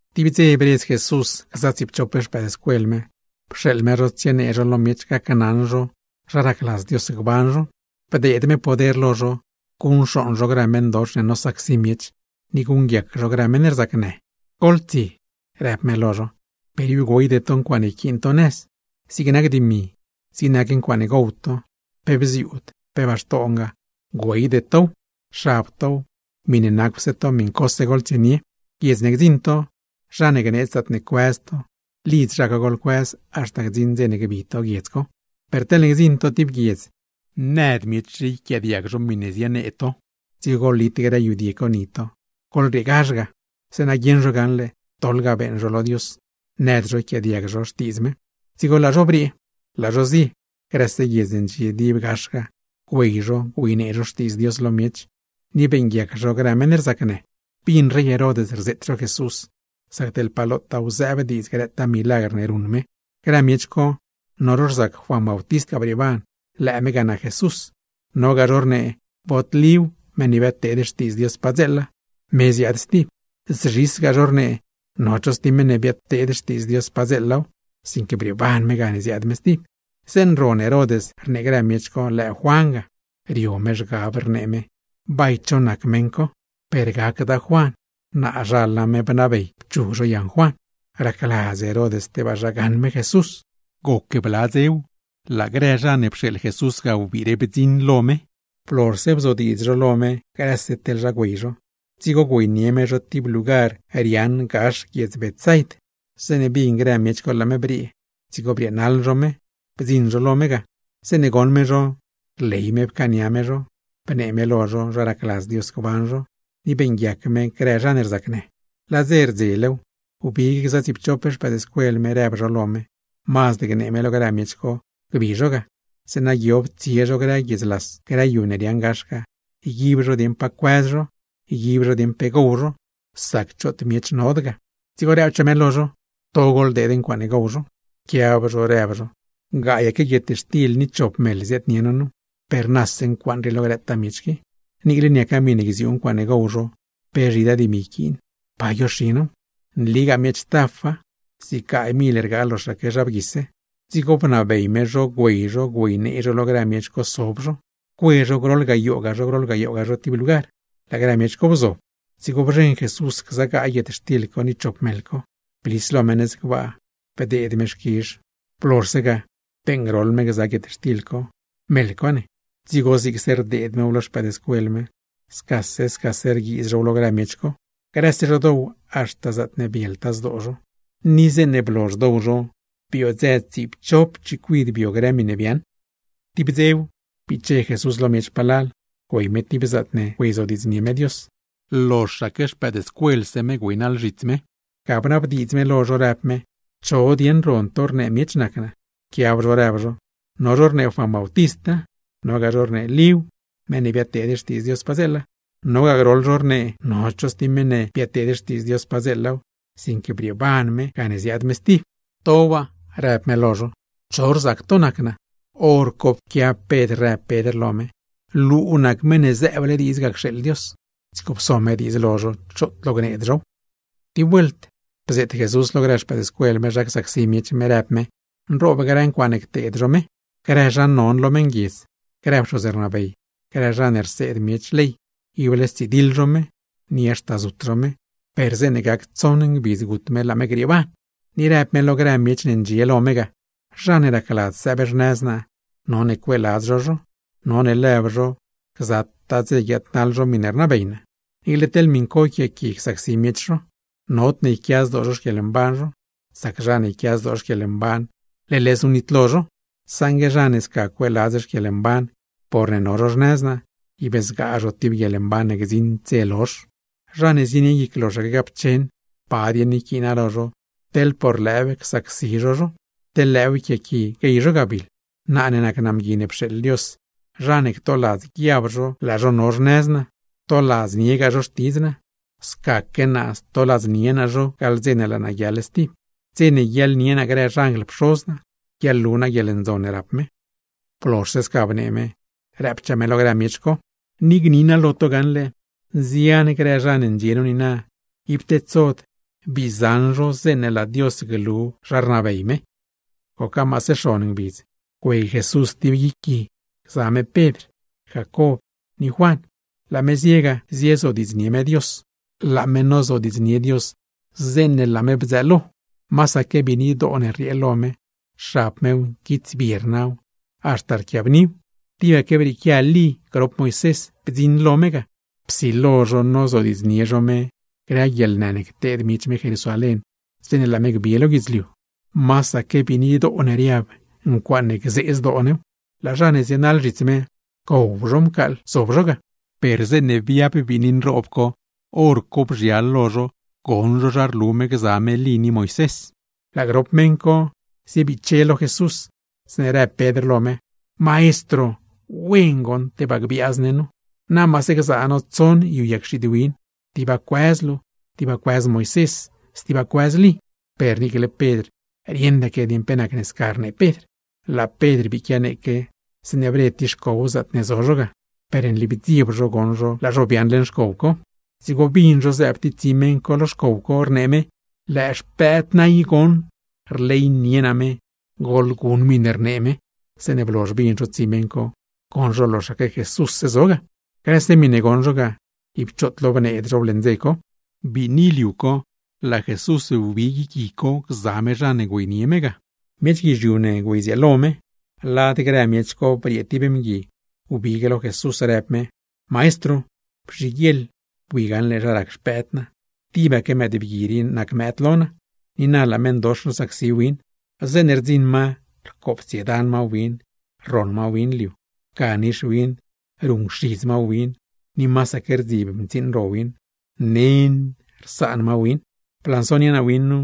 Tib dze bredz Jesús gza tsiipchop xpëëdscuel me, pxeeḻ me zho tsienee zho lo miech gacnaṉ zho zha racladz Dios gban zho; bdeed me poder lo zho guṉcxooṉ zho grë meṉdox ne nosacsi miech, ni guṉguiac zho grë meṉ rzacnë. ―Goḻtsie ―rëb me lo zho―. Per ib güeyde to ncuaaṉe yquiin to nëz. Zig nac dimi, zig nac ncuaaṉe gow to, pe bziuud, pe baxtongaa, güeyde tow; xab tow, miṉe nacwse to miṉcose goḻtsienie. Guiedz ne gdziṉ to, zha ne gneedz zaatne cuëz to, lidz zha co goḻcuëz, haxta gdziṉ dze ne gbi to guiedz co. Per teḻne gdziṉ to tib guiedz, nëd miech yquiaadiag zho miṉe zienee to, dzigo goḻlit grë yudie co ni to, goḻrieegazh ga, zeeṉa guieṉ zho gaṉle doḻ ga beeṉ zho lo Dios, nëd zho ycaania zho xtiidz me. Dzigo laa zho briee, laa zho zie. Grëse guiedz ne ndxie dib gax ga, güey zho güeynee zho Xtiidz Dios lo miech, ni beeṉguiac zho grë meṉ rzacnë. Bin rey Herod rzeet zho Jesús, sac teḻ pa lotaaw zëëb diidz grëtaa milagr ne ruṉ me. Grë miech co, no zho rzac Juan Bautist ga brieeban, lëë me ga nac Jesús; nogaa zho rnee bod Líw, meṉ ne biadteed xtiidz Dios padzeela, me ziaad stib; zzhisgaa zho rnee no cho stib meṉ biadteed xtiidz Dios padzeelaw, sinque brieeban me gane ziaad me stib. Zeeṉe ron Herod rnee grë miech co lëë Juan ga, rio me zhgab, rnee me: ―¿Bay cho nac meṉ co? Per gacda Juan; naazhal name bnabey pchug zho yaṉ Juan. Racladz Herod tebaa zha gaṉ me Jesús. Goc bla dzew, laa grë zha ne pxeeḻ Jesús ga wbire bdziṉ lo me. Blozhse bzodiidz zho lo me grëse teḻ zha güey zho, dzigo güeynie me zho tib lugar riaaṉ gax guiedz Betsaid. Zeeṉe bin grë miech co laa me briee, dzigo brieenaḻ zho me, bdziṉ zho lo me ga. Zeeṉe goṉ me zho, rley me pcaania me zho, bnee me lo zho zha racladz Dios gban zho, ni beeṉguiac me grë zha ne rzacnë. Laa dze rdzelew, wbig gza tsiipchop xpëëdscuel me rëb zho lo me, mazd gnee me lo grë miech co gbi zho ga; zeeṉa guiob tsie zho grë guiedz las, grë yu ne riaaṉ gax ga, yguib zho dieṉ pa cuëz zho, yguib zho dieṉ pe gow zho; sac choot miech nod ga. Dzigo rëbchaa me lo zho: ―To goḻdeed ncuaaṉe gow zho. Pquiab zho rëb zho: ―Gaayaque guietxtil ni chop meḻ ziaadnie no nu, ¡pe rnase ncuaaṉ co lo grëtaa miech qui! Niicle niaca miṉe gziuu ncuaaṉe gow zho, pe zhidaa dimi yquiin, ¿pa guioxi now? Nligaa miech tafa, zig gaay mil rgaa loxaque zha bguise. Dzigo bnabey me zho güey zho, güeynee zho lo grë miech co sob zho, cue zho groḻ gayooga, groḻ gayooga zho tib lugar. Laa grë miech co bzob, dzigo bzheṉ Jesús gza gaay guietxtil co ni grop meḻ co, blis lo me nëz gbaa, bdeed me xquizh lo Dios. Blozhse ga, beeṉgroḻ me gza guietxtil co, meḻ co ne, dzigo zigse rdeed mew lo xpëëdscuel me, scase scase rguiiz zhow lo grë miech co. Grëse zho dow haxta zaatne bieltaa zdoo zho; ni zeeṉe blozh dow zho, biodzë tsiipchop chicuid bio grë miṉe biaaṉ. Tib dze biche Jesús lo miech palal, güey me tib zaatne güeyzodiidznie me Dios; loxaque xpëëdscuelse me güeynaḻ zhits me. Ga bnabdiidz me lo zho rëb me: ―¿Cho dieṉ ron to rnee miech nac naa? Pquiab zho rëb zho: ―No zho rnee Juan Bautista, nogaa zho rnee Líw (meṉ ne biadteed Xtiidz Dios padzeela); nogaa groḻ zho rnee no cho stib meṉ ne biadteed Xtiidz Dios padzeelaw, sinque brieeban me gane ziaad me stib. ―¿To waa? ―rëb me lo zho―. ¿Cho rzac to nac naa? Horco pquiab Pedr, rëb Pedr lo me: ―¡Luu nac Meṉ ne zëëble diidz ga cxeeḻ Dios! Dzigo pso me diidz lo zho choot lo gneed zhow. Tib vuelt bzeet Jesús lo grë xpëëdscuel me zha csacsi miech me. Rëb me, nroob grë ncuaaṉe cteed zho me; grë zha non lo meṉguiedz, grë pxoz rnabey, grë zha ne rseed miech ley, ible stsidiḻ zho me, ni haxta zut zho me; per zeeṉe gac tsoṉ ngbidz gut me laa me grieeban. Ni rëb me lo grë miech ne ndxie lo me ga: ―Zha ne racladz sëëb xnëz naa, none cueeladz zho zho, none lëb zho gzataa dze guiaadnaḻ zho miṉe rnabey naa, niicle teḻ miṉ co yquiaaqui csacsi miech zho. Nodne yquia zdoo zho xquieḻmban zho, sac zha ne yquia zdoo xquieḻmban, leḻ znu nitlo zho; saṉgue zha ne sca cueeladz xquieḻmban porne no zho xnëz naa, ib zgaa zho tib guieḻmban ne gdziṉd dze lozh. Zha ne zienie guic loxaque gapcheṉ, ¿pa dieṉ yquiina lo zho, teḻ por lëëw rsacsi zho zho, teḻ lëëw yquiaaqui guey zho gabiḻ? Naa ne nac naa Mgui ne pxeeḻ Dios, zha ne ctoladz guiab zho laa zho no xnëz naa, ctoladzniegaa zho xtidz naa; scaque naa stoladznie naa zho gaḻ dze ne laa naa guiaḻ stib. Dze ne guiaḻnie naa grë xanjl Pxoz naa, guiaḻlu naa guieḻndzon ne rap me. Blozhse sca bnee me, rëbchaa me lo grë miech co: ―Ni gni naa lo to gaṉle, nzian grë zha ne ndxie nu niina, ib tedsod bii zaṉ zho zeeṉe laa Dios glu zha rnabey me. Goca maase xon ngbidz, güey Jesús tib guic gui gza me Pedr, Jacob ni Juan; laa me zie ga ziezodiidznie me Dios. Laa me nozodiidznie Dios, zeeṉe laa me bdzëëlo. Masaque biinidoo ne rriee lo me, xab mew, nquitsbie rnaw, haxta rquiabniw. Tibaque brieequia Lí grop Moisés bdziṉ lo me ga, psilo zho nozodiidznie zho me grë guieḻnë ne cteed miech me Jerusalén, zeeṉe laa me gbi lo guidzliu. Masaque biinidoo ne riab, ncuaaṉe gzee zdoo new. Laa zha ne zienaḻ zhits me, rcow zho mcaaḻ zob zho ga; per zeeṉe biab biini nroob co, hor co bzhial lo zho goṉ zho zha rlu me gza me Lí ni Moisés. Laa grop meṉ co ziebiche lo Jesús, zeeṉe rëb Pedr lo me: ―Maestro, ¡wena goṉ tebaa gbiaaz ne nu! Na maase gzaa no tsoṉ yu yag xiid win, tiba cuëz luu, tiba cuëz Moisés, stiba cuëz Lí. Per niicle Pedr rieṉdaque dieṉ pe nacne sca rnee Pedr. Laa Pedr bii quianeeque, zeeṉe bre tib xcow zaatne zo zho ga; per nli bdzieb zho goṉ zho laa zho biaaṉ leṉ xcow co. Dzigo bin zho zëëb tib tsi meṉ co lo xcow co, rnee me: ―Lëë Xpëëd naa i goṉ, rleynie naa me. Goḻgon miṉe rnee me. Zeeṉe blozh bin zho tsi meṉ co, goṉ zho loxaque Jesússe zo ga. Grëse miṉe goṉ zho ga, ib choot lo bneed zhow leṉ dze co. Biini liu co, laa Jesús wbi guic gui co gza me zha ne güeynie me ga. Miech guizhiu ne güeydzieelo me. Lad grë miech co briee tib mgui, wbig me lo Jesús rëb me: ―Maestro, bzhiguieḻ bui gaṉle zha rac xpëëd naa. Tibaque mëëdbgui rii nac mëëd lo naa, ni na laa meṉdox nosacsi win. Zeeṉe rdziṉ ma rcoptsiedan ma win, rroṉ ma win liu, ga nix win ruṉcxidz ma win, ni masaque rdzib mtsiiṉ ro win; nen rsaan ma win. Blansonie naa win nu,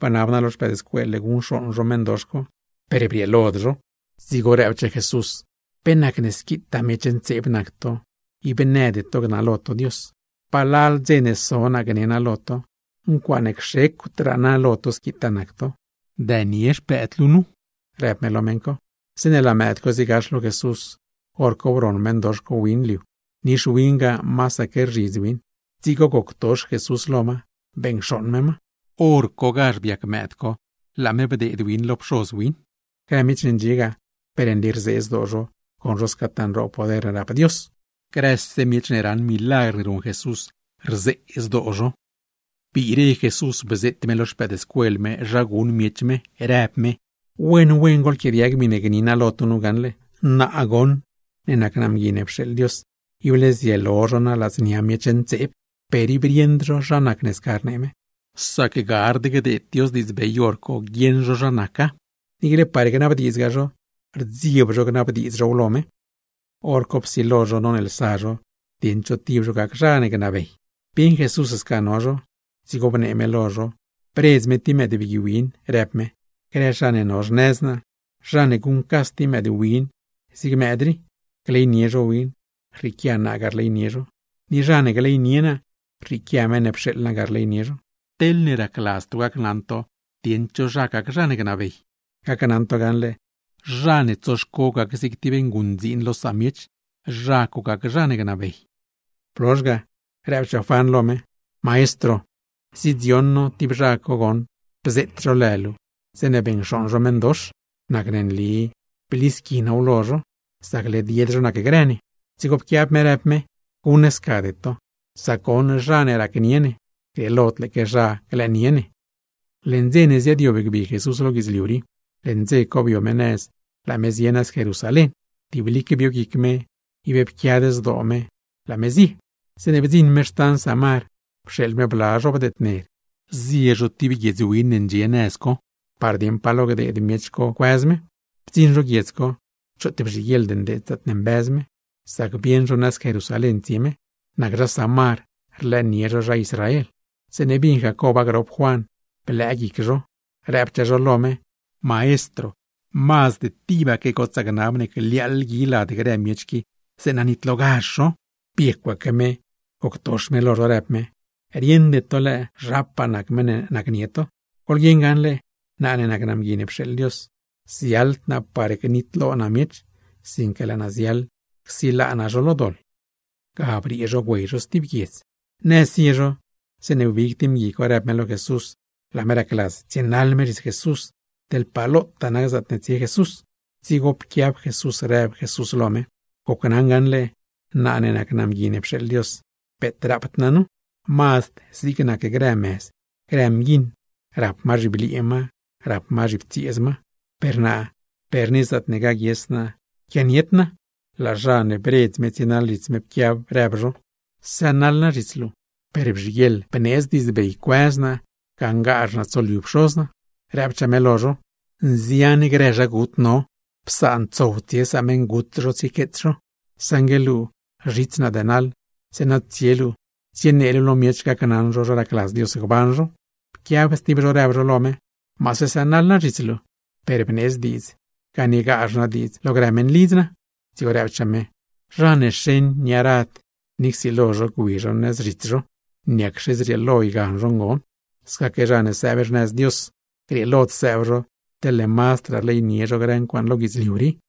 bnab naa lo xpëëdscuel luu guṉcxooṉ zho meṉdox co, per brieelod zho. Dzigo rëbchaa Jesús: ―¡Pe nac squitaa miech ntseeb nac to, ib nëde to gnalo to Dios! ¿Pa lal dze ne so naa gne naa lo to? ¡Ncuaaṉe cxecwdraa naa lo to squitaa nac to! Dënie xpëëd luu nu ―rëb me lo meṉ co. Zeeṉe laa mëëd co ziegax lo Jesús, hor co broṉ meṉdox co win liu, nix win ga masaque rzhidz win. Dzigo goctox Jesús lo ma, beṉcxooṉ me ma. Horcogazh biac mëëd co, laa me bdeed win lo pxoz win. Grë miech ne ndxie ga, per nli rzee zdoo zho goṉ zho scataa nroob poder ne rap Dios. Grëse miech ne raṉ grëtaa milagr ne ruṉ Jesús, rzee zdoo zho. Biire Jesús bzeet me lo xpëëdscuel me zha guṉ miech me, rëb me: ―Wen wen goḻquiaadiag miṉe gni naa lo to nu gaṉle. Naa goṉ ne nac naa Mgui ne pxeeḻ Dios, ible zielo zho naa ladznia miech. Per ib rieṉd zho zha nacne sca rnee me, sac gard gdeed Dios diidzbey hor co guieṉ zho zha naca; niicle par gnabdiidzgaa zho, rdzieb zho gnabdiidz zhow lo me. Horco psilo zho noneelsa zho dieṉ cho tib zho gac zha non. Bieṉ Jesús sca no zho, dzigo bnee me lo zho, bredz me tib mëëdbgui win, rëb me: ―Grë zha ne no xnëz naa, zha ne guṉcas tib mëëdwin zig mëëd rii, gleynie zho win, rrieequia naa ga rleynie zho. Ni zha ne gleynie naa, rrieequia meṉ ne pxeeḻle naa ga rleynie zho. Teḻne racladz to gacnaṉ to dieṉ cho nac zha non, gacnaṉ to gaṉle, zha ne tsoxco gac zig tib nguṉdziin lo samiech, zha co nac zha non. Blozh ga, rëbchaa Juan lo me: ―Maestro, bdzioṉ no tib zha co goṉ bzeet zho lë luu zeeṉe beṉcxooṉ zho meṉdox, nacne nli blisqui now lo zho, sac led yed zho nacgrë ne. Dzigo pquiab me, rëb me: ―¡Guṉscade to! Sac goṉ zha ne racnie ne, grieelod lëëque zha glëënie ne. Leṉ dze ne ziaadyob gbi Jesús lo guidzliu rii, leṉ dze co bio me nëz laa me zie nëz Jerusalén. Tiblique bio guic me, ib pquiad zdoo me, laa me zie. Zeeṉe bdziṉ me xtan Samar, pxeeḻ me bla zho bdedner zie zho tib guiedz win ne ndxie nëz co, par dieṉ pa lo gdeed miech co cuëz me. Bdziṉ zho guiedz co, choot bzhiguieḻd ndeed zaatne mbëz me; sac bieṉ zho nëz Jerusalén tsie me. Nac zha Samar, rlëënie zho zha Israel. Zeeṉe bin Jacoba grop Jacob Juan, blëë guic zho, rëbchaa zho lo me: ―Maestro, ¡mazd tibaque gotsaa gnab ne gliaaḻ gui lad grë miech rii, zeeṉa nitlogazh zho! Biecwaque me, goctox me lo zho rëb me: ―Rieṉde to lëë zhapaa nac meṉ ne nacnie to. Goḻguieṉ gaṉle, naa ne nac naa Mgui ne pxeeḻ Dios, ziaḻd naa par gnitlo naa miech, sinque laa naa ziaḻ csilaa naa zho lo doḻ. Ga briee zho güey zho stib guiedz. Nëz zie zho, zeeṉe wbig tib mgui co rëb me lo Jesús, laa me racladz tsienaḻ me zhits Jesús, teḻ pa lotaa nac zaatne tsie Jesús. Dzigo pquiab Jesús rëb Jesús lo me: ―Gocnaṉa gaṉle, naa ne nac naa Mgui ne pxeeḻ Dios, peet rapd naa nu, mazd zig nac grë mëz, grë mguiṉ, rap ma zhibliee ma, rap ma zhiptsieez ma; per naa per ni zaatne gaguies naa quianied naa. Laa zha ne bredz me tsienaḻ zhits me, pquiab zho rëb zho: ―Sënaḻ naa zhits luu, per bzhiguieḻ bneedz diidzbey cuëz naa, gaṉgazh naa tsoliu pxoz naa. Rëbchaa me lo zho: ―Nzian grë zha gut no, psaan tsow tsie sameṉgut zho tsiequeets zho. Saṉgue luu zhits naa dënaḻ, zeeṉa tsie luu tsienee luu lo miech, gacnaṉ zho zha racladz Dios gban zho. Pquiab stib zho rëb lo me: ―Maase sënaḻ naa zhits luu, per bneedz diidz ganiegazh naa diidz lo grë meṉlidz naa. Dzigo rëbchaa me: ―Zha ne xeṉ nia rad ni csilo zho gwi zho nëz zhits zho, niacxe zrieelo ygan zho ngon. Scaque zha ne sëëb xnëz Dios, grieelod sëëb zho teḻne mazdraa rleynie zho grë ncuaaṉ lo guidzliu rii.